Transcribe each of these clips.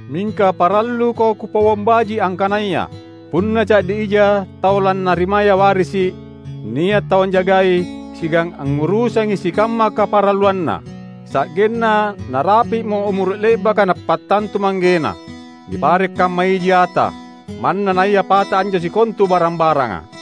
Mingka paralluko kupauang baji’ angkanaya: punna ca’di ija tau lannarimaya warisi’, nia’ tau anjagai siagang angngurusangi sikamma kaparalluanna, sa’genna narapi’mo umuru’ le’baka napattantu manggena. Nipare’ kamma iji ata, manna naia pata anjo sikontu barang-baranga.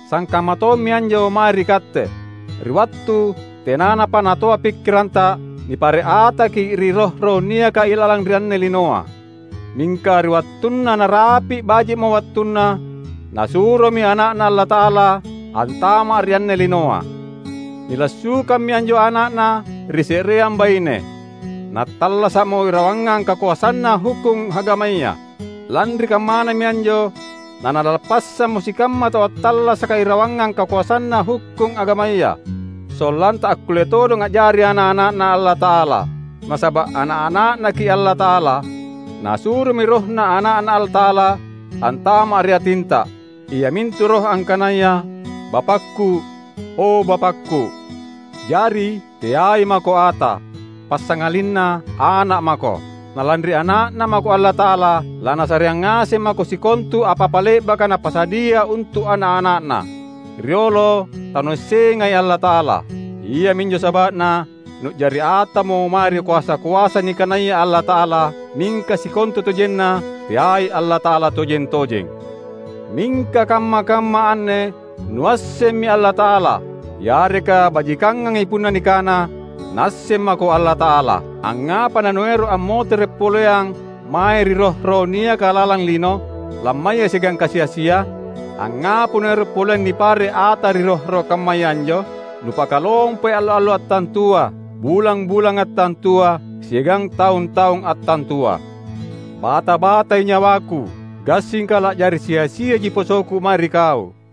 Sangkamma tommi anjo mae ri katte. Ri wattu tenanapa natoa pikkiranta, nipare’ ataki’ ri roh-roh niaka ilalang ri anne linoa. Mingka ri wattunna narapi’ baji’mo wattunna, Nasuromi Ana’Na Allata’ala antama’ ri anne linoa. Nilassukammi anjo ana’Na ri se’reang baine, nattallasa’mo irawangang kakoasanna hukkung agamaya. Lanri kammanami anjo naNalappassammo sikamma tau attallasaka irawangang kakoasanna hukkung agamaya; sollanta akkulle todong a’jari ana’-ana’Na Allata’ala. Nasaba’ ana’-ana’Naki’ Allata’ala, Nasuromi RohNa Ana’Na Allata’ala antama’ ri atinta; iamintu Roh angkanaya, "Bapakku, o Bapakku." Jari, teai mako ata, passangalinna ana’ mako. Na lanri ana’Na mako Allata’ala, laNasareang ngaseng mako sikontu apa-apa le’baka Napasadia untu’ ana’-ana’Na. Riolo tanuassengai Allata’ala. Iaminjo saba’na nu’jari atamo mae ri koasa-koasa nikanaya allata’ala, mingka sikontutojenna teai Allata’ala tojeng-tojeng. Mingka kamma-kamma anne nuassemmi Allata’ala; yareka bajikangangi punna nikana, Naasseng mako Allata’ala. Angngapa nanuero’ ammotere’ poleang mae ri roh-roh niaka lalang lino, lammaya siagang kasi-asia? Angngapa nuero’ poleang nipare’ ata ri roh-roh kammaya anjo? Nupakalompoi allo-allo attantua, bulang-bulang attantua, siagang taung-taung attantua. Bata-batai nyawaku, gassingka la’jari sia-siaji posoku mae ri kau.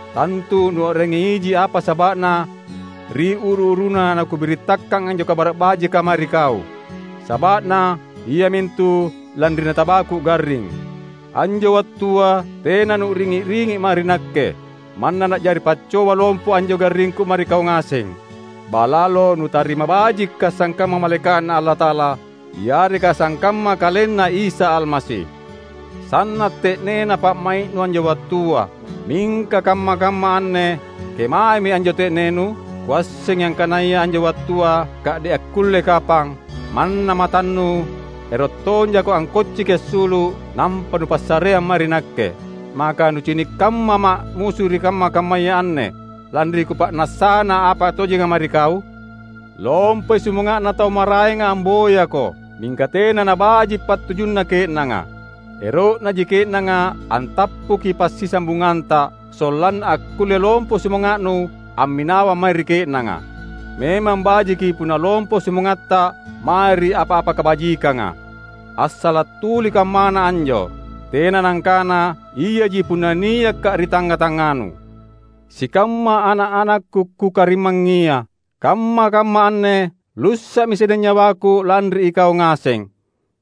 Tantu nuu’rangi iji apa saba’na ri uru-uruna nakubirittakang anjo Kabara’ Bajika mae ri kau. Saba’na, iamintu lanri natabaku garring. Anjo wattua tena nu’ringi’-ringi’ mae ri nakke, manna na’jari paccoba lompo anjo garringku mae ri kau ngaseng. Ba’lalo nutarima bajikka’ sangkamma malaeka’Na Allata’ala yareka sangkamma KalenNa Isa Almasi. Sanna’ te’nena pa’mai’nu anjo wattua. Mingka kamma-kamma anne, kemaemi anjo te’nenu? Kuassengi angkanaya anjo wattua ka’de’ akkulle kapang, manna matannu ero’ tonjako angkocciki assulu’ nampa nupassareang mae ri nakke. Maka nucini’ kammama’ musu ri kamma-kammaya anne, lanri kupa’nassana apa tojenga mae ri kau? Lompoi sumanga’na tau maraenga amboyako, mingka tena nabaji’ pattujunna ke’nanga. Ero’naji ke’nanga antappuki passisambunganta, sollanna akkulle lompo sumanga’nu amminawang mae ri ke’nanga. Memang bajiki punna lompo sumangatta mae ri apa-apa kabajikanga. Assala’ tuli kammana anjo. Tena nangkana iaji punna niakka’ ri tangnga-tangnganu. Sikamma ana’-anakku kukarimangngia! Kamma-kamma anne lussa’mi sedeng nyawaku lanri ikau ngaseng.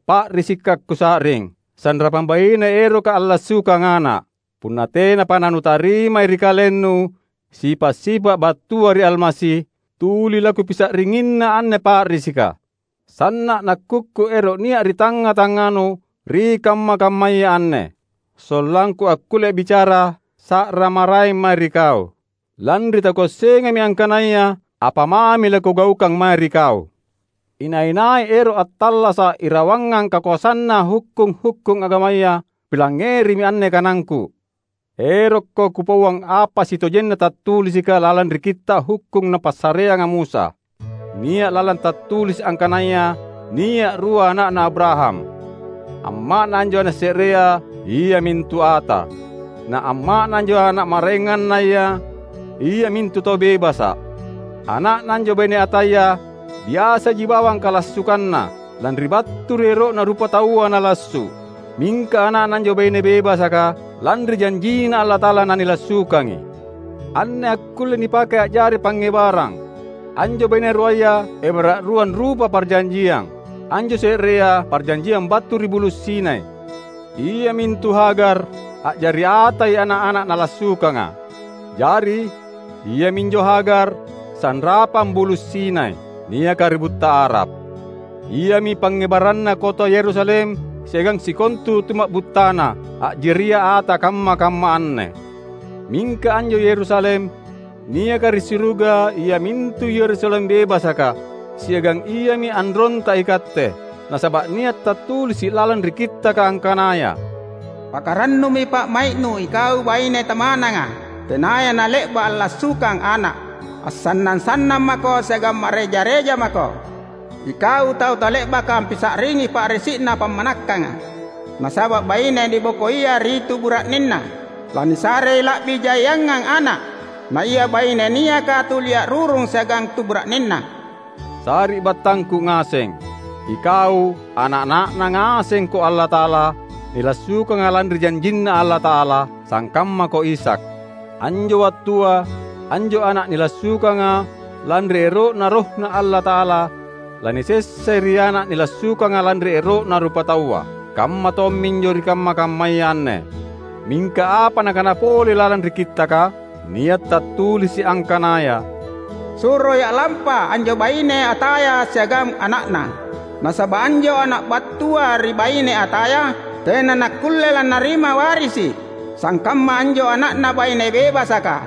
Pa’risikka’ kusa’ring, sanrapang baine eroka allassukang ana’. Punna tenapa nanutarima ri kalennu sipa’-sipa’ battua ri Almasi, tuli lakupisa’ringinna anne pa’risika! Sanna’ nakkukku ero’ nia’ ri tangnga-tangnganu ri kamma-kammaya anne; sollangku akkulle a’bicara sa’ra maraeng mae ri kau, lanri takuassengami angkanaya apa mami lakugaukang mae ri kau! Inai-nai ero’ attallasa’ irawangang kakoasanna hukkung-hukkung agamaya, pilangngerimi anne kanangku! Erokko kupauang apa sitojenna tattulisika lalang ri Kitta’ Hukkung napassareanga Musa. Nia’ lalang tattulisi’ angkanaya nia’ rua ana’na Abraham: amma’na anjo ana’ se’rea iamintu ata. Na amma’na anjo ana’ maraengannaya iamintu tau bebasa’. Ana’na anjo baine ataya, biasaji bawang kalassukanna, lanri battu ri ero’na rupataua nalassu’. Mingka ana’na anjo baine bebasaka, lanri janjinNa Allata’ala nanilassukangi. Anne akkullei nipake a’jari pangngebarang. Anjo baine ruaya ebara’ ruang rupa parjanjiang: anjo se’rea parjanjiang battu ri Bulu’ Sinai — iamintu Hagar; a’jari atai ana’-ana’ nalassukanga. Jari, iaminjo Hagar sanrapang Bulu’ Sinai, niaka ri butta Arab. Iami pangngebaranna kota Yerusalem siagang sikontu tuma’buttana, a’jaria ata kamma-kamma anne. Mingka anjo Yerusalem, niaka ri suruga iamintu Yerusalem bebasaka, siagang iami anronta ikatte. Nasaba’ nia’ tattulisi’ lalang ri Kittaka angkanaya, "Pakarannumi pa’mai’nu ikau baine tamananga, tenaya nale’ba’ allassukang ana’! Assannang-sannang mako siagang ma’reja-reja mako ikau tau tale’baka ampisa’ringi pa’risi’na pammanakkanga! Nasaba’ baine nibokoia ri tu bura’nenna lanisarei la’bi jaiangang ana’, na ia baine niaka tuli a’rurung siagang tu bura’nenna." Sari’battangku ngaseng! Ikau ana’-ana’Na ngasengko Allata’ala, nilassukanga lanri janjinNa Allata’ala; sangkammako Ishak. Anjo wattua, anjo ana’ nilassukanga lanri ero’Na RohNa Allata’ala lanisessai ri ana’ nilassukanga lanri ero’na rupataua. Kamma tomminjo ri kamma-kammaya anne. Mingka apa nakana pole lalang ri Kittaka? Nia’ tattulisi’ angkanaya: "Suroi a’lampa anjo baine ataya siagang ana’na, nasaba’ anjo ana’ battua ri baine ataya tena nakkulle lannarima warisi’ sangkamma anjo ana’na baine bebasaka."